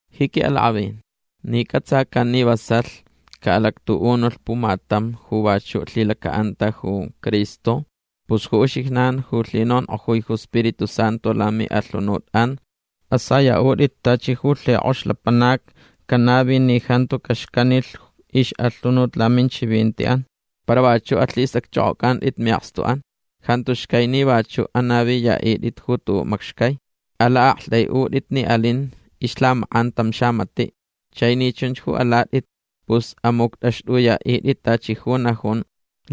Ji quiʼalakʼavin ni cʼatsacan ni vasalh caʼalactuʼunulh pumatam ju vachuʼ lhilacaʼanta ju Cristo pus ju uxijnan ju lhinonkʼojui ju Spiritu Santu lamiʼalhunutʼan asayaʼutʼit tachi ju lhikʼox lapanac canavi ni jantu caxcanilh ixʼalhunut laminchivintiʼan. Para vachuʼ alhistʼacchʼokʼocʼantʼit miʼakstuʼan. Jantu xcai ni vachuʼ anaviyaʼitʼit ju tuʼuʼ macxcai. Alaʼaktʼaiʼutʼit ni alin ixlhamakʼan tam xamatiʼ. Chai ni chunch ju alatʼit pus amuctʼaxtʼuyaʼitʼit tachi ju najun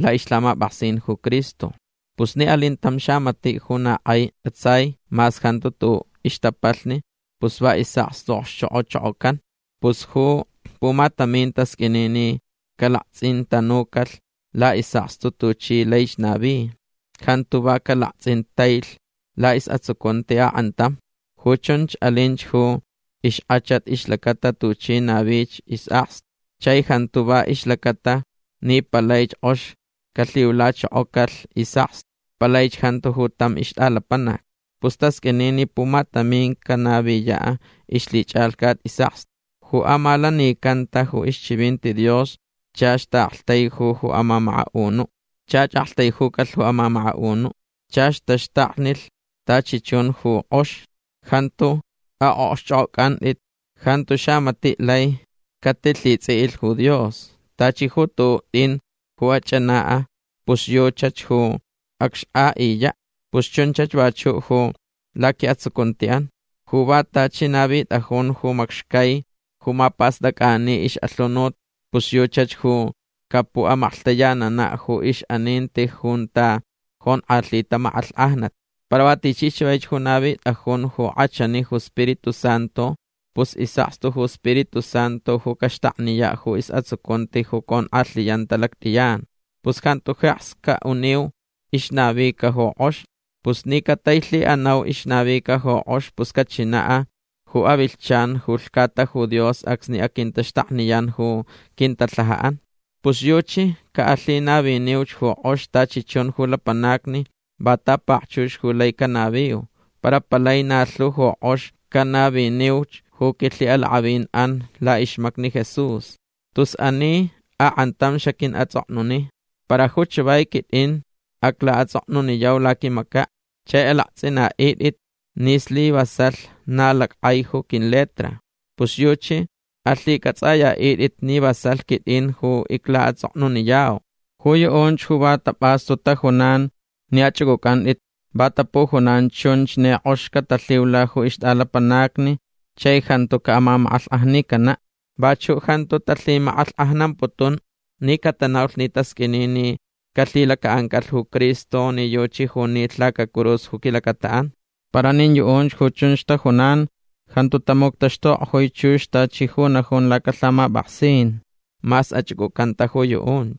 laʼixlhamapʼaksin ju Cristo. Pus ni alin tam xamatiʼ ju na kʼai cʼatsai mas jantu tuʼuʼ ixtapalhni pus va isʼakstu okxchokʼochokocan. Pus ju pumatamin tasqʼuini ni calaktsʼintanucalh laʼisʼakstu tuchi laich navi. Jantu va calaktsʼintailh laʼisʼatsucunti akʼantam. Ju chunch alinch ju ixkʼachat ixlacata tuchi navich isʼakstu. Chai jantu va ixlacata ni palaich kʼox calhiulachokocalh isʼakstu. Palaich jantu ju tam ixtʼalapanac. Pus tasqʼuini ni pumatamin canaviyaʼ ixlhichʼalhcat isʼakstu. Ju amalanicanta ju ixchivinti Dios chach taʼaktaiju ju amamakaʼunuʼ. Chach aktaijucalh ju amamakaʼunuʼ. Chach taxtaknilh tachi chun ju kʼox. Jantu aʼokxchʼokʼocʼantʼit. Jantu xamatiʼ lai catilhitsʼiʼilh ju Dios. Tachi ju tuʼuʼ tʼin ju acchʼanaʼ pus yuchach ju acxkʼaʼiyaʼ. Pus chunchach vachuʼ ju laquiʼatsucuntiʼan. Ju va tachi navitʼajun ju macxcai ju mapastʼacʼani ixʼalhunut pus yuchach ju capuʼamaklhtayananaʼ ju ixʼaninti junta jonkʼalhita makʼalhkʼajnat. Para va tichi chavaich ju navitʼajun ju kʼachani ju Spiritu Santu pus isʼakstu ju Spiritu Santu ju caxtakniyaʼ ju isʼatsucunti ju conkʼalhiyanta lactʼiyan. Pus jantu jeks caʼuniu ixnavica ju kʼox. Pus ni catailhiʼanau ixnavica ju kʼox pus cachinaʼ ju avilhchan ju lhcata ju Dios acsni aquintaxtakniyan ju quintalhajaʼan. Pus yuchi caʼalhinaviniuch ju kʼox tachi chun ju lapanacni va tapakchux ju lai canaviu. Para palai na lhu ju kʼox canaviniuch ju quilhiʼalakʼavinʼan laʼixmacni Jesús. Tus ani akʼantam xaquiʼatsʼoknuni. Para ju chavai quitʼin ju aclaʼatsʼoknuniyau laquimacaʼ. Chai alaktsʼintʼit ni slivasalh na lackʼai ju quiletra. Pus yuchi alhicʼatsʼayaʼitʼit ni vasalh quitʼin ju iclaʼatsʼoknuniyau. Ju yuʼunch ju va tapʼastu tajunan ni achʼucʼucʼantʼit va tapujunan chunch ni kʼox catalhiula ju ixtʼalapanacni chai jantu caʼamamakʼalhkʼajnicanaʼ. Vachuʼ jantu talhimakʼalhkʼajnamputun ni catanaulh ni tasqʼuini ni calhilacaʼancalh ju Cristo ni yuchi ju nilh lacacurus ju quilacataʼan. Para nin yuʼunch ju chunch tajunan jantu tamuctaxtukʼojui chux tachi ju najun lacalhamapʼaksin mas achʼucʼucanta ju yuʼunch.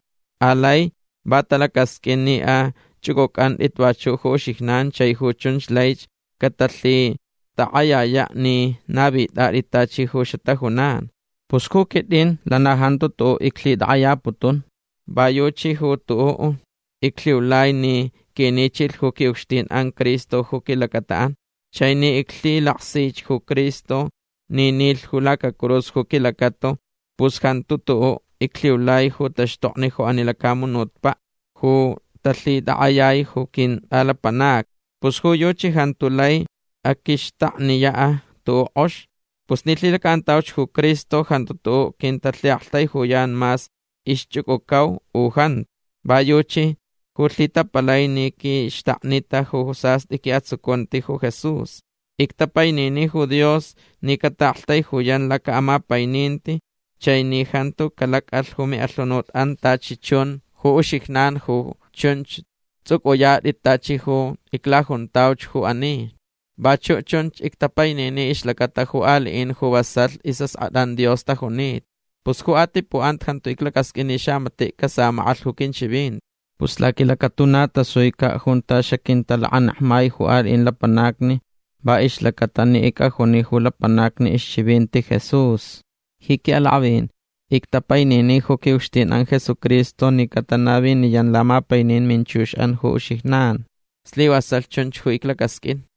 Alai va talacasqʼuin ni achʼucʼucʼantʼit vachuʼ ju uxijnan chai ju chunch laich catalhitakʼayayaʼ ni navitʼatʼit tachi ju xatajunan. Pus ju quitʼin lana jantu tuʼuʼ iclhitakʼayaputun. Va yuchi ju tuʼuʼ iclhiulai ni quinichilh ju quiʼucxtinʼan Cristo ju quilacataʼan. Chai ni iclhilaksich ju Cristo ni nilh ju lacacurus ju quilacata pus jantu tuʼuʼ iclhiulai ju taxtokni ju ani lacamunutpaʼ ju talhitakʼayai ju quintʼalapanacni. Pus ju yuchi jantu lai aquixtakniyaʼ tuʼuʼ kʼox. Pus ni lhilacaʼantauch ju Cristo pus jantu tuʼuʼ quintalhiʼaktaijuyan mas ixchʼucʼucau u jantu. Va yuchi ju lhitapalai ni quixtaknita ju sastʼi quiʼatsucunti ju Jesús. Ictapainini ju Dios ni cataʼaktaijuyan lacaʼamapaininti chai ni jantu calacʼalh ju miʼalhunutʼan tachi chun ju uxijnan ju chunch tsʼucʼuyatʼit tachi ju iclajuntauch ju ani. Vachuʼ chunch ictapaini ixlacata ju aliʼin ju vasalh isʼaskʼatʼan Dios tajunita. Pus ju atipuʼanta jantu iclacasqʼuin ni xamatiʼ casamakʼalh ju quinchivinti. Pus laquilacatuna tasuicaʼ junta xaquintalakanekmai ju aliʼin lapanacni va ixlacata ni icʼajuni ju lapanacni ixchivinti Jesús. Ji quiʼalakʼavin ictapainini ju quiʼucxtinʼan Jesucristo ni catanaviniyan lamapainin minchuxʼan ju uxijnan. Slivasalh chunch ju iclacasqʼuin.